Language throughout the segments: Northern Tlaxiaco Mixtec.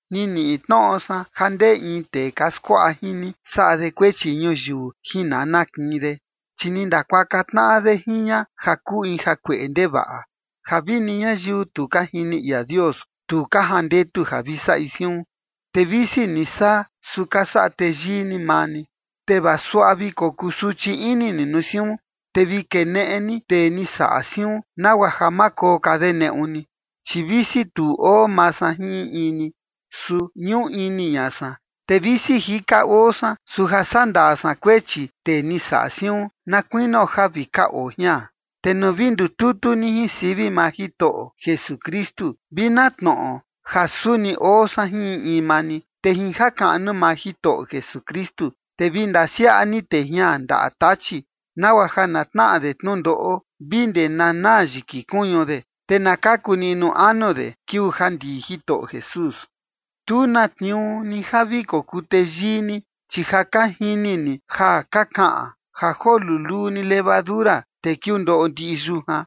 Ni niꞌi tnoꞌo san ja ndee in tee ka skuaꞌa jin ni saꞌa de kuechi ñuyiu jin nana kiin de, chi ni ndakuaka tnaꞌa de jin ña ja kuu in jakueꞌe ndevaꞌa, ja vini ñayiu tu ka jini ia Dios tu ka jandetu ja vi saꞌi siun. Te visi ni saa, su ka saꞌa teyii ni maa ni. Te vaa suaꞌa vi kokuu suchi ini ni nuu siun, te vi keneꞌe ni tee ni saꞌa siun, nagua ja ma koo ka de neꞌu ni. Chi visi tu oo maa san jin in in ni, su ñuꞌu ini ña san. Te visi jika oo san, su ja sandaa san kuechi tee ni saꞌa siun, na kuinio ja vi ka oo jian. Te nuu vi ndututu ni jin sivi maa Jitoꞌo Jesukristu, vi na tnoꞌo ja suni oo san jin in in maa ni. Te jin jakaꞌnu maa Jitoꞌo Jesukristu, te vi ndasiaꞌa ni tee jian ndaꞌa Tachi, nagua ja na tnaꞌa de tnundoꞌo vi ndee na naa yiki kuñu de, te na kaku niꞌnu anu de kiuu ja ndii Jitoꞌo Jesús. Tu na tniuu ni ja vi kokuu teyii ni, chi ja ka jini ni ja ka kaꞌan: “Ja joo luluu ni levadura, te kiundoꞌo ndiꞌi yujan”.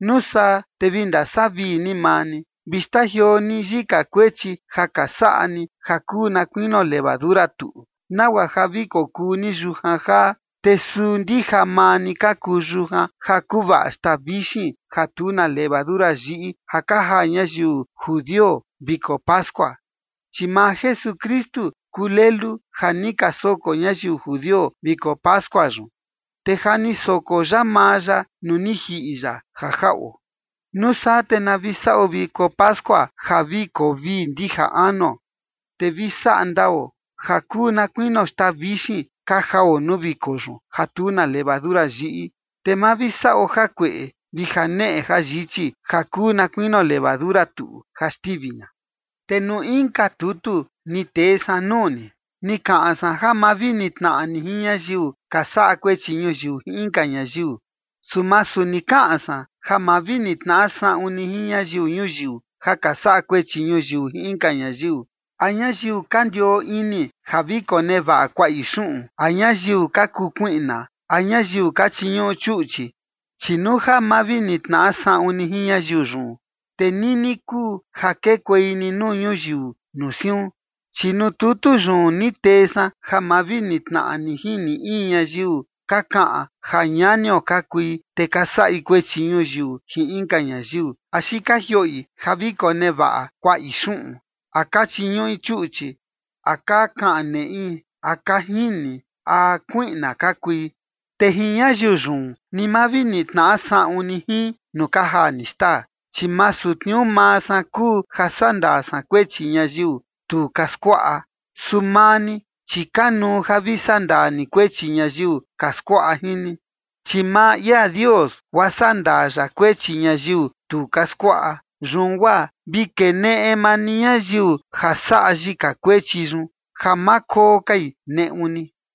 Nuu saa, te vi ndasavii ni maa ni. Vi xtajioo ni yika kuechi ja ka saꞌa ni ja kuu na kuinio levadura tuꞌu, nagua ja vi kokuu ni yujan jaa. Te suu ndija maa ni ka kuu yujan ja kuvaꞌa xtaa vixin ja tu na levadura yiꞌi ja ka jaa ñayiu judio viko pascua. Chi maa Jesukristu kuu lelu ja ni ka soko ñayiu judio viko pascua yun, te ja ni soko ya maa ya nuu ni jiꞌi ya ja jaꞌo. Nuu saa te na vi saꞌo viko pascua ja vi koo vii ndija anuo, te vi saꞌa ndao, ja kuu na kuinio xtaa vixin ka jao nuu viko yun ja tu na levadura yiꞌi, te ma vi saꞌo jakueꞌe vi janeꞌe jayichi ja kuu na kuinio levadura tuꞌu ja xtivi ña. Te nuu inka tutu ni tee san nuu ni, ni kaꞌan san ja ma vi nitnaꞌa ni jin ñayiu ka saꞌa kuechi ñuyiu jin inka ñayiu. Su masu ni kaꞌan san ja ma vi nitnaꞌa saꞌun ni jin ñayiu ñuyiu ja ka saꞌa kuechi ñuyiu jin inka ñayiu, a ñayiu ka ndioo ini ja vi konevaꞌa kuaꞌi xuꞌun, a ñayiu ka kuu kuiꞌna, a ñayiu ka chiñuꞌu chuꞌchi, chi nuu ja ma vi nitnaꞌa saꞌun ni jin ñayiu yun, te nini kuu ja kekuei ni nuu ñuyiu nuu siun. Chi nuu tutu yun ni tee san ja ma vi nitnaꞌa ni jin ni in ñayiu ka kaꞌan ja ñanio ka kui, te ka saꞌi kuechi ñuyiu jin inka ñayiu, axi ka jioꞌi ja vi konevaꞌa kuaꞌi xuꞌun, a ka chiñuꞌi chuꞌchi, a ka kaꞌan neꞌi, a ka jini, a kuiꞌna ka kui. Te jin ñayiu yun ni ma vi nitnaꞌa saꞌun ni jin nuu ka jaa ni xtaa. Chi masu tniuu maa san kuu ja sandaa san kuechi ñayiu tu ka skuaꞌa. Su maa ni, chi kanuu ja vi sandaa ni kuechi ñayiu ka skuaꞌa jin ni. Chi maa ia Dios guaa sandaa ya kuechi ñayiu tu ka skuaꞌa. Yun guaa vi keneꞌe maa ni ñayiu ja saꞌa yika kuechi yun, ja ma koo kai neꞌu ni.